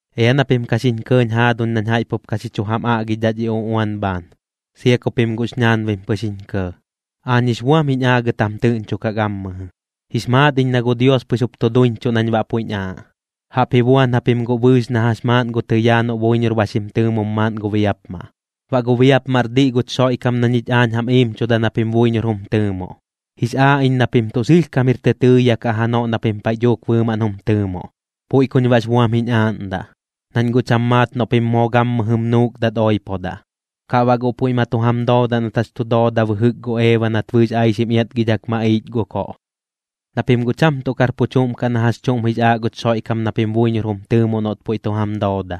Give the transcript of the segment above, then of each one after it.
Ea na pim ka xiñ kɇɇñ jaaduñ nañ jaiꞌ pup ka xi chu jam aꞌgidhaꞌ dhi uꞌuan bhaan, sia ku pim guꞌx ñaanbim pɨx jiñ kɇɇ. Aañ jix buam jiñ aagɨt jam tɨꞌñchokaꞌ gammɨjɨ, jix maat iñ na gu Dios pɨx jup tu duiñchuꞌ nañ baꞌ puiꞌñ aaꞌ, jaꞌp ji buan japim guꞌ bɨɨx na jax maaꞌn gu tɨyaa noꞌ buiñor ba xim tɨɨmom maaꞌn gu biapmaꞌ. Baꞌ gu biapmaꞌr diꞌ guch Xoiꞌkam na ñich aañ jam iimchuda na pim buiñor jum tɨɨmoꞌ. Jix aaꞌ iñ na pim tuꞌ sɨlhkam jir tɨtɨɨya kaꞌ janoꞌ na pim paiꞌ dhuuk bɨɨmaꞌn jum tɨɨmoꞌ. Puiꞌ kuñ baꞌx buam jiñ aaꞌndaꞌ, nañ guꞌ cham maat noꞌ pim moo gammɨjɨm nuukdat oipodaꞌ, kaꞌ baꞌ guꞌ puiꞌ ma tu jam doodaꞌ nat jax chu dooda bɨjɨk gu Eeba nat bɨɨx aixim iatgidhak maꞌiich gu koꞌ. Na pim guꞌ cham tuꞌ kar pu chuꞌm kaꞌ na jax chuꞌm jix aaꞌ guch Xoiꞌkam na pim buiñor jum tɨɨmoꞌ noꞌt puiꞌ tu jam dooda.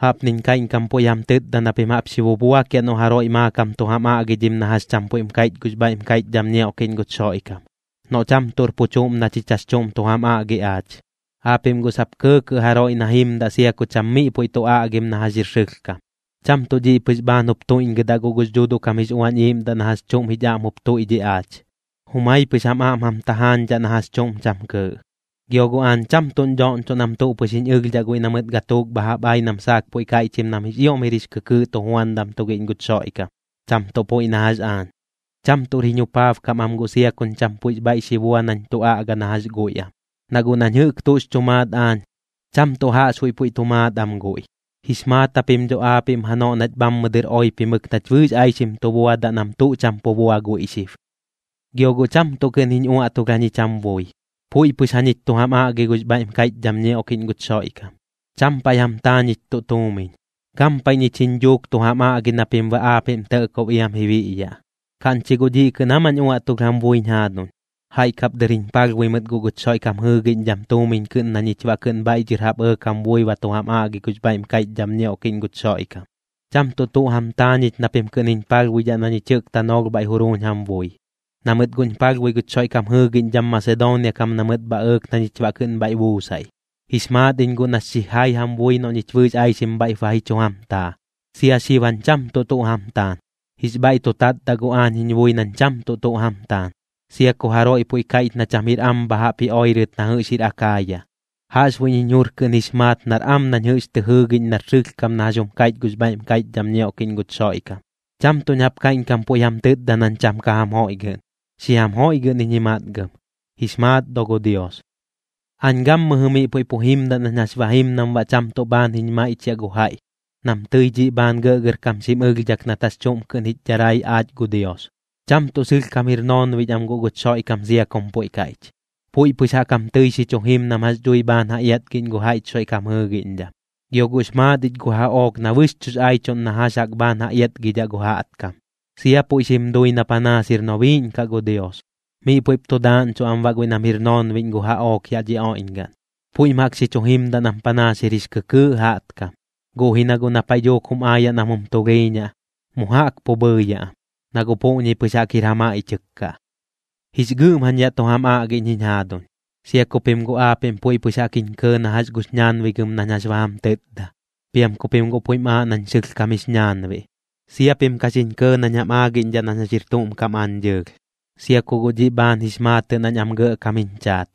Jaꞌpniñ kaiꞌñkam puiꞌ jam tɨtda na pim jaꞌp xi bubuakiaꞌ noꞌ jaroiꞌ maakam tu jam aꞌgidhim na jax cham puiꞌm kaiꞌch gux bhaiꞌm kaiꞌchdham ñioꞌkiꞌñ guch Xoiꞌkam, noꞌ cham tuꞌr pu chuꞌm na chich jax chuꞌm tu jam aꞌgi aach. Aapiꞌm guꞌ sap kɇɇkɇꞌ jaroiꞌ na jimdaꞌ sia ku cham miꞌ puiꞌ tu aꞌgim na jax jir sɨlhkam. Cham tuꞌ dhiꞌ pɨx bhaan jup tuiꞌñgɨdaꞌ guꞌ gux Dhuuduꞌ kam jix Uañ Iiꞌmdaꞌ na jax chuꞌm jich aꞌm jup tuiꞌdhiꞌ aach, jumai pɨx jam aꞌm jam tajaañdhaꞌ na jax chuꞌm cham kɨɨꞌ. Gio guꞌ aañ cham tuꞌñ dhoꞌñchoꞌ nam tuꞌ pɨx jiñ ɨlhdhaꞌ guiꞌ na mɨt gatuuk bha jaꞌp ai nam saak puiꞌ kaiꞌchim nam jix ioꞌm jir jix kɨkɨɨꞌ tujuandam tugiꞌñ guch Xoiꞌkam, cham tuꞌ puiꞌ na jax aañ. Cham tuꞌr jiñ jupaabkam am guꞌ sia kuñ cham puiꞌx bhaiꞌ xi bua nañ tu aꞌga na jax guiꞌ am, na guꞌ nañ jɨꞌk tuꞌx chu maat aañ, cham tuꞌ jaꞌxbuiꞌ puiꞌ tu maat am guiꞌ. Jix maat japim dho aapiꞌm janoꞌ nach bhammɨ dɨr oipimɨk nach bɨɨx aixim tu buadaꞌ nam tuꞌ cham pu bua guiꞌ xib. Gio guꞌ cham tuꞌ kɨꞌn jiñ uaꞌtulh jañich jam bui. Puiꞌ pɨx jañich tu jam aꞌgi gux bhaiꞌm kaiꞌchdham ñioꞌkiꞌñ guch Xoiꞌkam, cham paiꞌ jam taa ñich tuꞌ tuumiñ. Gampaiꞌ ñich jiñ dhuuk tu jam aꞌgi na pim baꞌ aapiꞌm tɇꞌkob iam ji biꞌyaꞌ. ¿Kaꞌñ chi guꞌ dhiꞌ kɨꞌn aa mañ uaꞌtulh jam buiñ jaaduñ? Jaiꞌ kap dɨr jiñ palhbui mɨt guꞌ guch Xoiꞌkam jɨɨgiꞌñdham tuumiñ kɨꞌn na ñich baꞌ kɨꞌn bhaiꞌ dhɨr jaꞌp ɇɇk jam bui ba tu jam aꞌgi gux bhaiꞌm kaiꞌchdham ñioꞌkiꞌñ guch Xoiꞌkam. Cham tuꞌ tuꞌ jam taa ñich na pim kɨꞌn jiñ palhbuidhaꞌ na ñich jɨꞌk tanoolh bhaiꞌ juruuñ jam bui, na mɨt guꞌñ palhbui guch Xoiꞌkam jɨɨgiꞌñdham Masedoonia kam na mɨt bha ɇɇk na ñich baꞌ kɨꞌn bhaiꞌ buusaiꞌ. Jix maat iñ guꞌ nax xijai jam bui noꞌ ñich bɨɨx aixim bhaiꞌp ba ji chu jam taa, sia xib jañ cham tuꞌ tuꞌ jam taan. Jix bhaiꞌ tu tatdaꞌ guꞌ aañ jiñ bui nañ cham tuꞌ tuꞌ jam taan, sia ku jaroiꞌ puiꞌ kaiꞌch na cham jir am bha jaꞌp ji oirɨt na jɨꞌx jir Akaaya. Jaꞌxbuiꞌñ jiñ jur kɨꞌn jix maat nar am nañ jɨꞌx tɨ jɨɨgiꞌñ nar sɨlhkam na jax jum kaiꞌch gux bhaiꞌm kaiꞌchdham ñioꞌkiꞌñ guch Xoiꞌkam. Cham tuꞌñ jaꞌp kaiꞌñkam puiꞌ jam tɨtda nañ cham ka jam joiꞌgɨꞌn, xi jam joiꞌgɨꞌn iñ ji matgɨm, jix maat do gu Dios. Aañ gammɨjɨ miꞌ puiꞌ pu jimdaꞌ nañ jax ba jim nam baꞌ cham tuꞌ bhaan jiñ maiꞌchiaꞌ gu jaiꞌ nam tɨi dhiꞌ bhaan gɇꞌgɇrkam xim ɨlhdhak nat jax chuꞌm kɨꞌn jich dharai aach gu Dios. Cham tuꞌ sɨlhkam jir noonbiꞌñ am guꞌ guch Xoiꞌkam sia kum puiꞌ kaiꞌch, puiꞌ pɨx jaꞌk jam tɨi xi chu jim nam jax dhui bhaan ja iatgiꞌñ gu jaiꞌch Xoiꞌkam jɨɨgiꞌñdham. Gio guꞌx maat ich gu jaꞌook na bɨxchuꞌx aichuꞌn na jax jaꞌk bhaan ja iatgidhaꞌ gu jaꞌtkam, sia puiꞌ xim dui na panaas jir nobiiꞌñ kaꞌ gu Dios. Miꞌ puiꞌp tu daaꞌñchuꞌ am baꞌ guiꞌ nam jir noonbiꞌñ gu jaꞌook yaꞌ dhi oiꞌñgaꞌn, puiꞌm jaꞌk xi chu jimdaꞌ nam panaas jir jix kɨkɨɨꞌ jaꞌtkam, guꞌ ji na guꞌ na paiꞌ dhuuk jum aayaꞌ nam jum tulhiiñaꞌ, mu jaꞌk pu bhɨɨyaꞌ am, na guꞌ puꞌñi pɨx jaꞌk jir ja maiꞌchɨk kaꞌ. Jix gɨꞌm jañ yaꞌ tu jam aꞌgiꞌñ jiñ jaaduñ, sia ku pim guꞌ aapiꞌm puiꞌ pɨx jaꞌk jiñ kɇɇ na jax gux ñaanbigɨm nañ jax ba jam tɨtda, piam ku pim guꞌ puiꞌm aaꞌ nañ sɨlhkam jix ñaanbiꞌ. Sia pim ka xiñ kɇɇ nañ jam aagiꞌñdhaꞌ nañ jax jir tuꞌm kam aañ dɨɨlh, sia ku guꞌ dhiꞌ bhaan jix maatɨꞌ nañ am gɇꞌkam jiñ chaat.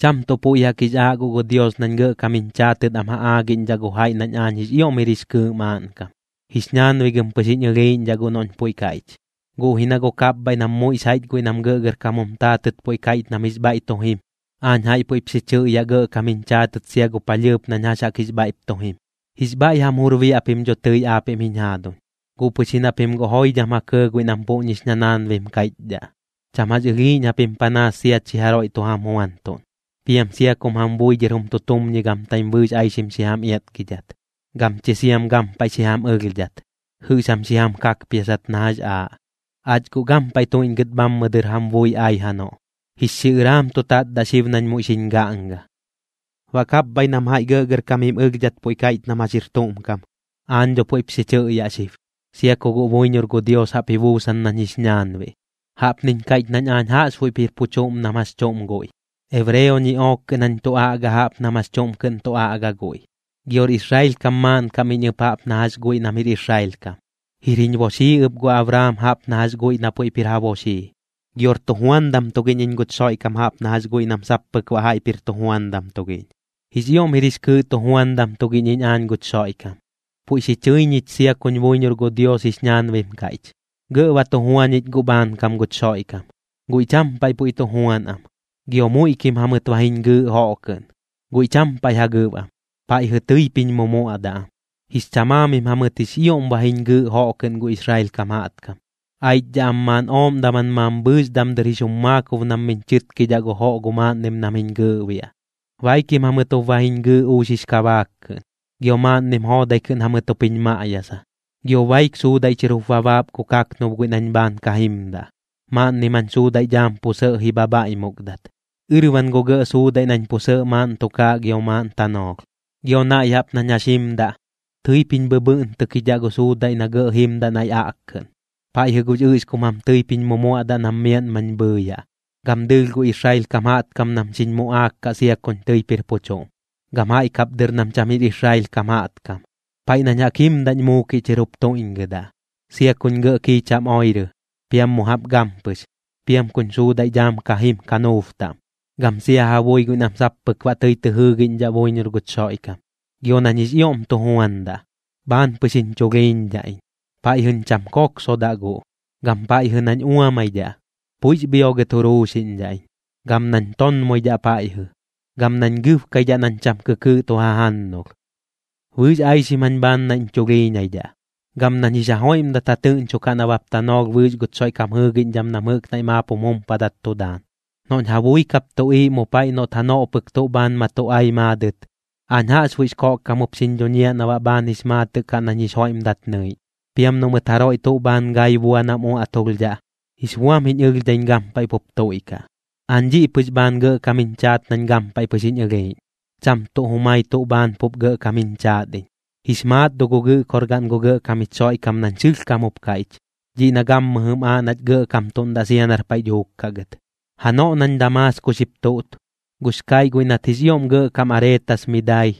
Cham tuꞌ puiꞌ jaꞌk jix aaꞌ guꞌ gu Dios nañ gɇꞌkam jiñ chaatɨt am ja aagiꞌñdhaꞌ gu jaiꞌ nañ aañ jix ioꞌm jir jix kɨɨꞌ maaꞌnkam, jix ñaanbigɨm pɨx jiñ ɨlhiiꞌñdhaꞌ guꞌ noꞌñ puiꞌ kaiꞌch. Guꞌ ji na guꞌ kapbhaiꞌ nam muiꞌx jaiꞌch guiꞌ nam gɇꞌgɇrkam jum taatɨt puiꞌ kaiꞌch nam jix bhaiꞌ tu jim, aañ jaiꞌ puiꞌp xi chɨꞌyaꞌ gɇꞌkam jiñ chaatɨt sia gu palhɨɨp nañ jax jaꞌk jix bhaiꞌp tu jim. Jix bhaiꞌ jam jur biaꞌ pim dho tɨi aapiꞌm jiñ jaaduñ, guꞌ pɨx ji na pim guꞌ joidham ja kɇɇ guiꞌ nam puꞌñix ñanaanbim kaiꞌchdhaꞌ. Cham jax ɨlhiiꞌñ japim panaas sia chi jaroiꞌ tu jam juantuꞌn, piam sia kum jam bui dhɨr jum tutumñigamtaim bɨɨx aixim xi jam iatgidhat, gam chi siam gampaiꞌ xi jam ɨlhdhat, jɨꞌx jam xi jam kakpiasat na jax aaꞌ. Aach guꞌ gampaiꞌ tuiꞌñgɨt bhammɨ dɨr jam bui ai janoꞌ, jix xiꞌɨraam tu tatdaꞌ xib nañ muiꞌ xiñ gaꞌnga. Baꞌ kapbhaiꞌ nam jaiꞌ gɇꞌgɇrkam jim ɨlhdhat puiꞌ kaiꞌch nam jax jir tuꞌm kam, aañ dho puiꞌp xi chɨꞌyaꞌ xib, sia ku guꞌ buiñor gu Dios jaꞌp ji buusan nañ jix ñaanbiꞌ. Jaꞌpniñ kaiꞌch nañ aañ jaꞌxbuiꞌp jir pu chuꞌm nam jax chuꞌm guiꞌ, ebreo ñiꞌook kɨꞌn jañ tu aꞌga jaꞌp nam jax chuꞌm kɨꞌn tu aꞌga guiꞌ, gior Israel kam maaꞌnkam iñ ɨp jaꞌp na jax guiꞌ nam jir Israel kam, jir jiñ boxii ɨp gu Abraam jaꞌp na jax guiꞌ na puiꞌp jir ja boxii. Gior tujuandam tugiꞌñ iñ guch Xoiꞌkam jaꞌp na jax guiꞌ nam sap pɨk baꞌ jaiꞌp jir tujuandam tugiꞌñ. Jix ioꞌm jir jix kɨɨꞌ tujuandam tugiꞌñ iñ aañ guch Xoiꞌkam, puiꞌ xi chɨi ñich sia kuñ buiñor gu Dios jix ñaanbim kaiꞌch. Gɇꞌ ba tu jua ñich guꞌ bhaankam guch Xoiꞌkam, guiꞌ cham paiꞌ puiꞌ tu juan am. Gio muiꞌkim jamɨt ba jiñ gɨɨꞌ joꞌ kɨꞌn, guiꞌ cham paiꞌ ja gɨb am, paiꞌjɨ tɨip jiñ mumuaꞌdaꞌ am. Jix chamaamim jamɨt jix ioꞌm ba jiñ gɨɨꞌ joꞌ kɨꞌn gu Israel kam jaꞌtkam, aichdhaꞌ am maaꞌn ooꞌm daman mambhɨɨx damdɨr jix jum maakob nam miñ chɨtkidhaꞌ gu joꞌ gu maaꞌnnim nam jiñ gɨɨꞌbiaꞌ. Baikim jamɨt jup ba jiñ gɨɨꞌ uux jix kabaak kɨꞌn, gio maaꞌnnim joodai kɨꞌn jamɨt jup jiñ maꞌyasa. Gio baik suudaiꞌ chɨr jup ba baap gu kaknub guiꞌ nañ bhaan ka jimdaꞌ. Maaꞌnnim jañ suudaiꞌ dhaam pu sɇꞌ ji bhabhaiꞌmukdat, ɨrban gu gɇꞌ suudaiꞌ nañ pu sɇꞌ maaꞌn tukaaꞌ gio maaꞌn tanoolh. Gio naiꞌ jaꞌp nañ jax jimdaꞌ, tɨip jiñ bhɨbhɨꞌntɨkidhaꞌ gu suudaiꞌ na gɇꞌ jimdaꞌ naiꞌ aꞌkkɨꞌn. Paiꞌjɨ gux ɨꞌxkum jam tɨip jiñ mumuaꞌdaꞌ nam miaꞌn mañ bhɨɨyaꞌ. Gam dɨɨlh gu Israel kam jaꞌtkam nam xiñ muꞌaak kaꞌ sia kuñ tɨip jir pu chuꞌm, gam jaiꞌ kap dɨr nam cham jir Israel kam jaꞌtkam. Paiꞌ nañ jaꞌk jimdaꞌñ muukiꞌ chɨr jup tuiꞌñgɨdaꞌ, sia kuñ gɇꞌ kiicham oirɨ, piam mu jaꞌp gampɨx, piam kuñ suudaiꞌ dhaam ka jim kanuub taꞌm, gam sia ja bui guiꞌ nam sap pɨk baꞌ tɨi tɨ jɨɨgiꞌñdhaꞌ buiñor guch Xoiꞌkam. Gio nañ jix ioꞌm tu juandaꞌ, bhaan pɨx jiñ chulhiiñdhaꞌ iñ, paiꞌjɨñ cham koksodaꞌ guꞌ, gam paiꞌjɨ nañ uamaidhaꞌ, puiꞌx bhiogɨt juruuxiꞌñdhaꞌ iñ. Gam nañ tonmoidhaꞌ paiꞌjɨ, gam nañ gɨbkaidhaꞌ nañ cham kɨkɨɨꞌ tu jajannulh. Bɨɨx aixim jañ bhaan naiꞌñ chulhiiñaidhaꞌ, gam nañ jix ja joiꞌmdat ja tɨꞌñchokaꞌ nabap tanoolh bɨɨx guch Xoiꞌkam jɨɨgiꞌñdham nam jɨꞌk naiꞌ maap jum jumpadat tu daan. Noꞌñ ja bui kap tuꞌiiꞌ mu paiꞌ noꞌt janoꞌ pɨk tuꞌ bhaan ma tu ai maadɨt, aañ jaꞌxbuiꞌx koꞌkkam jup xiñ dhuñiaꞌ na baꞌ bhaan jix maatɨꞌ kaꞌ nañ jix joiꞌmdat nɨiꞌñ. Piam noꞌ mɨt jaroiꞌ tuꞌ bhaan gai bua nam uaꞌtulhdhaꞌ, jix buam jiñ ɨlhdhaiñ gampaiꞌ pup tuiꞌkaꞌ. Aañ dhiꞌ pɨx bhaan gɇꞌkam jiñ chaat nañ gampaiꞌ pɨx jiñ ɨlhiiꞌñ, cham tuꞌ jumai tuꞌ bhaan pup gɇꞌkam jiñ chaat iñ. Jix maat do gu Gɨꞌkorgaꞌn gu Gɇꞌkam jich Xoiꞌkam nañ sɨlhkam jup kaiꞌch, dhiꞌ na gammɨjɨm aaꞌ nach gɇꞌkamtuꞌndaꞌ sia nar paiꞌ dhuuk kaꞌ gɨt. Janoꞌ nañ Damaasko xip tuꞌt, gux kaiꞌ guiꞌ nat jix ioꞌm gɇꞌkam Areetas mi dai,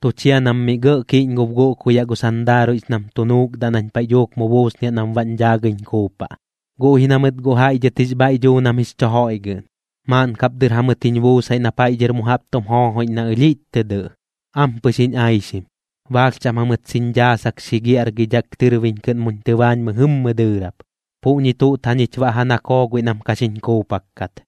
tu chia nam mi gɇꞌ kiꞌñgob guꞌkuyaꞌ gu sandaaruiꞌx nam tu nuukdaꞌ nañ paiꞌ dhuuk mu buusniaꞌ nam baꞌñ dhaagɨiñ kuupaꞌ. Guꞌ ji na mɨt guꞌ jaiꞌ dhɨt jix bhaiꞌ duu nam jix chu joiꞌgɨꞌn, maaꞌn kap dɨr jamɨt jiñ buusaiꞌ na paiꞌ dhɨr mu jaꞌp tum joojoiꞌñ na ɨlhiꞌch tɨ dɨꞌ, ampɨx jiñ aixim. Baalh chaꞌm jamɨt xiñ dhaasak xi giaꞌrgidhak tɨrbiñ kɨꞌn muñ tɨbaañ mɨjɨmmɨ dɨɨrap. Puꞌñi tuꞌt jañich baꞌ ja nakoo guiꞌ nam ka xiñ kuupak kat.